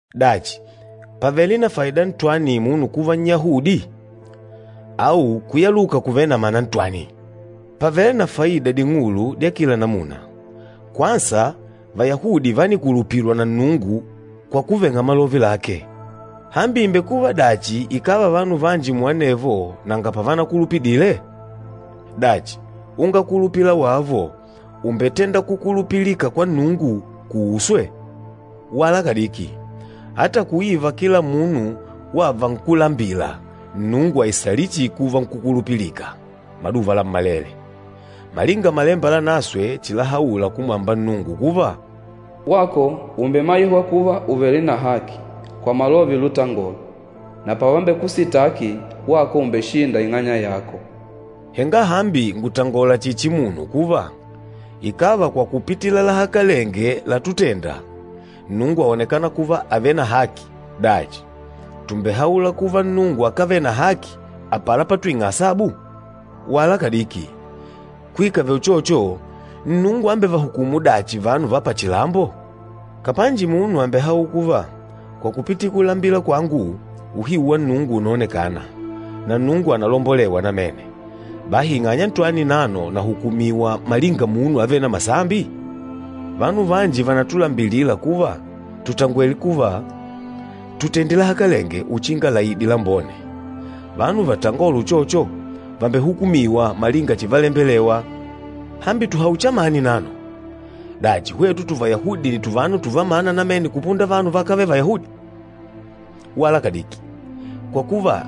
Dachi, pàvele na faida ntwani munu kuva Nnyahudi? Au kuyaluka kùvele na mana ntwani? Pàvele na faida ding'ulu dya kila namuna. Kwansa, Vayahudi vánikulupilwa na Nnungu kwa kuveng'a malove lake. Hambi ìmbekuva dachi ikàva vanu vanji muanevo nanga pavanakulupidile? Dachi, ungakulupila wavo ùmbetenda kukulupilika kwanga Nnungu kuuswe? Wala kadiki! Ata kuiva kila munu wava nkúlambila, Nnungu àisalila chihi kuva nkúkulupilika maduva lammalele. Malinga Malemba Lanaswe chilahaula kumwamba Nnungu kuva, “Wako ùmbemaihwa kuva ùvele na haki, kwa malove lutangola, na pavambekusitaki, wako ùmbeshinda ing'anya yako.” Henga hambi ngùtangola chihi chimunu kuva, ikàva kwa kupitila lahakalenge látutèndà, Nnungu àonekana kuva àvele na haki, dachi tùmbehaula kuva Nnungu akávele na haki apala patwing'a asabu? Wala kadiki! Kuikave uchocho, Nnungu ámbevahukumu dachi vanu va pachilambo? Kapanji munu àmbehaula kuva, “Kwa kupitila kulambila kwangu, uhiu wa Nnungu ùnaonekana, na Nnungu ànalombolewa namene, bahi ing'anya ntwani nano nahukumiwa malinga munu avêle na masambi?” Vanu vanji vànatulambilila kuva tùtangwele kuva, “Tutende lahakalenge uchinga laide lambone.” Vanu vatangôla uchocho, vàmbehukumiwa malinga chivalembelewa! Hambi tuhaule chamani nano? Dachi, hwetu tuvayahudi nni tuvanu tuvamana namene kupunda vanu vakávele Vayahudi? Wala kadiki! Kwa kuva,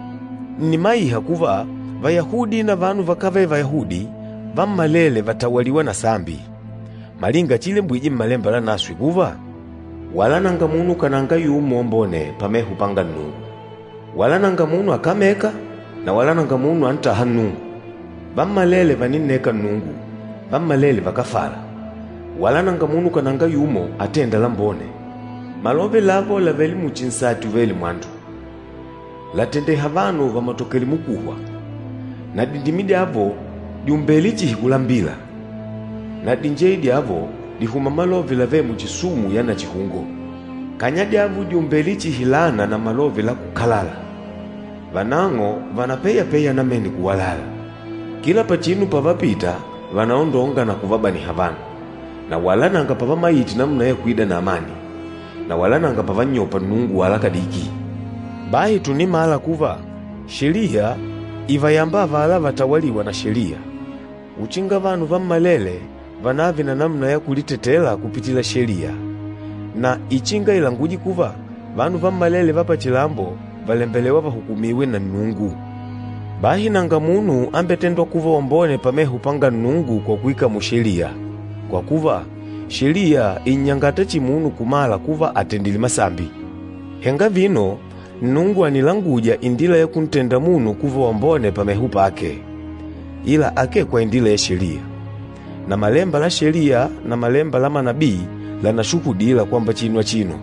ǹnimaiha kuva, Vayahudi na vanu vakávele Vayahudi, vammalele vàtawaliwa na sambi. Malinga chiilembwije Mmalemba Lanaswe kuva, “Wala nanga munu kananga yumo wambone pameho panga Nnungu! Wala nanga munu akamêka, na wala nanga munu antâha Nnungu. Vammalele vàninneka Nnungu, vammalele vakáfala. Wala nanga munu kananga yumo, atênda lambone. Malove lavo làvele muchi nsati uvêle mwandu, làtendeha vanu vamatokele mukuhwa. Na dindimi dyavo dìumbele chihi kulambila, na dinjeye dyavo dìhuma malove lavêle muchi sumu ya nachihungo. Kanya dyavo dìumbele chihi laana na malove lakukalala. Vanang'o vànapeyapeya namene kuwalala. Kila pachinu pavapita vànaondonga na kuvabaniha vanu, na wala nanga pavamaite namuna ya kuida na amani, na wala nanga pavannyopa Nnungu wala kadiki.” Bahi tùnimala kuva, Sheliya ìvayamba avala vatawalîwa na Sheliya, uchinga vanu vammalele vanààve na namuna ya kulitetela kupitila Sheliya, na ichinga ilanguje kuva, vanu vammalele va pachilambo vàlembelewa vahukumiwe na Nnungu. Bahi nanga munu ambetêndwa kuva wambone pameho panga Nnungu kwa kuikamula Sheliya, kwa kuva, Sheliya ìnnyangata chihi munu kumala kuva àtendile masambi. Henga vino, Nnungu ànilanguja indila ya kuntenda munu kuva wambone pameho pake, ila akee kwa indila ya Sheliya. Na malemba la Sheliya na malemba la manabii lànashuhudila kwamba chinu achino.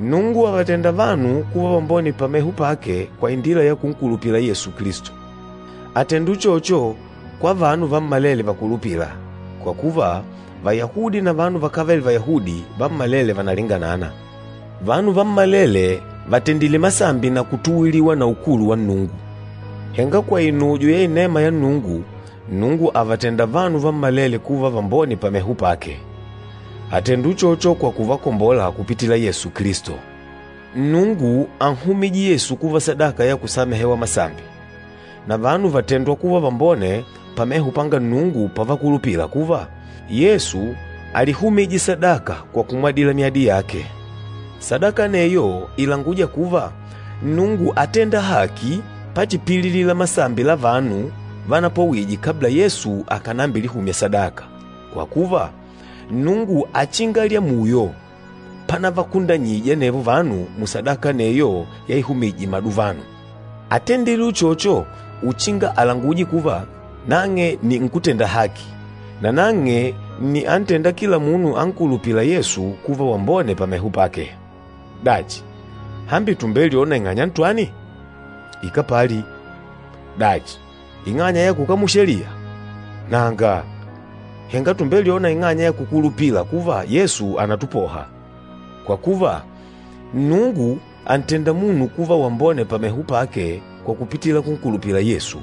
Nnungu àvatenda vanu kuva vambone pameho pake kwa indila ya kunkulupila Yesu Kilisto, àtenda uchocho kwa vanu vammalele vakulupîla, kwa kuva, Vayahudi na vanu vakávele Vayahudi vammalele vànalinganana. Vanu vammalele vàtendile masambi na kutuwiliwa na ukulu wa Nnungu. Henga kwa inujo ya inema ya Nnungu, Nnungu àvatenda vanu vammalele kuva vambone pameho pake. Àtenda uchocho kwa kuvakombola kupitila Yesu Kilisto. Nnungu ánnyumije Yesu kuva sadaka ya kusamehewa masambi. Na vanu vàtendwa kuva vambone pameho panga Nnungu pavakulupila kuva, Yesu álihumije sadaka kwa kumwadila myadi yake. Sadaka aneyo ìlanguja kuva, Nnungu átenda haki pachipililila masambi la vanu vánapwawije, kabla Yesu akànambilihumya sadaka, kwa kuva, Nnungu áchinga lyamuyo panavakundanyije anevo vanu musadaka aneyo yaihumije maduvano. Átendile uchocho uchinga alanguje kuva, nang'e nni mwene haki, nanang'e nni antênda kila munu ankulupîla Yesu kuva wambone pameho pake. Dachi, hambi tùmbelyona ing'anya ntwani? Ikápali! Dachi, ing'anya ya kukamula Sheliya? Nanga! Henga tùmbelyona ing'anya ya kukulupila kuva Yesu ànatupoha. Kwa kuva, Nnungu àntenda munu kuva wambone pameho pake kwa kupitila kunkulupila Yesu,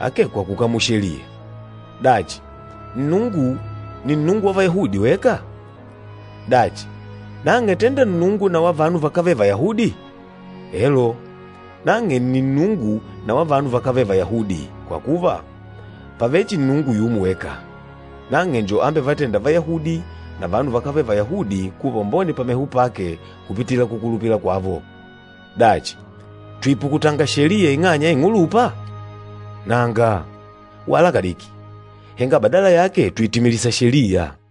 akee kwa kukamula Sheliya. Dachi, Nnungu ni Nnungu wa Vayahudi weka? Dachi, nang'e tenda Nnungu na wa vanu vakávele Vayahudi? Elo, nang'e nni Nnungu na wa vanu vakávele Vayahudi, kwa kuva, pàvele chihi Nnungu yumo weka. Nang'e njo ambevatênda Vayahudi na vanu vakávele Vayahudi kuva vambone pameho pake kupitila kukulupila kwavo. Dachi, tùipukutanga Sheliya ing'anya ya ing'ulupa? Nanga, wala kadiki! Henga badala yake tùitimilisa Sheliya.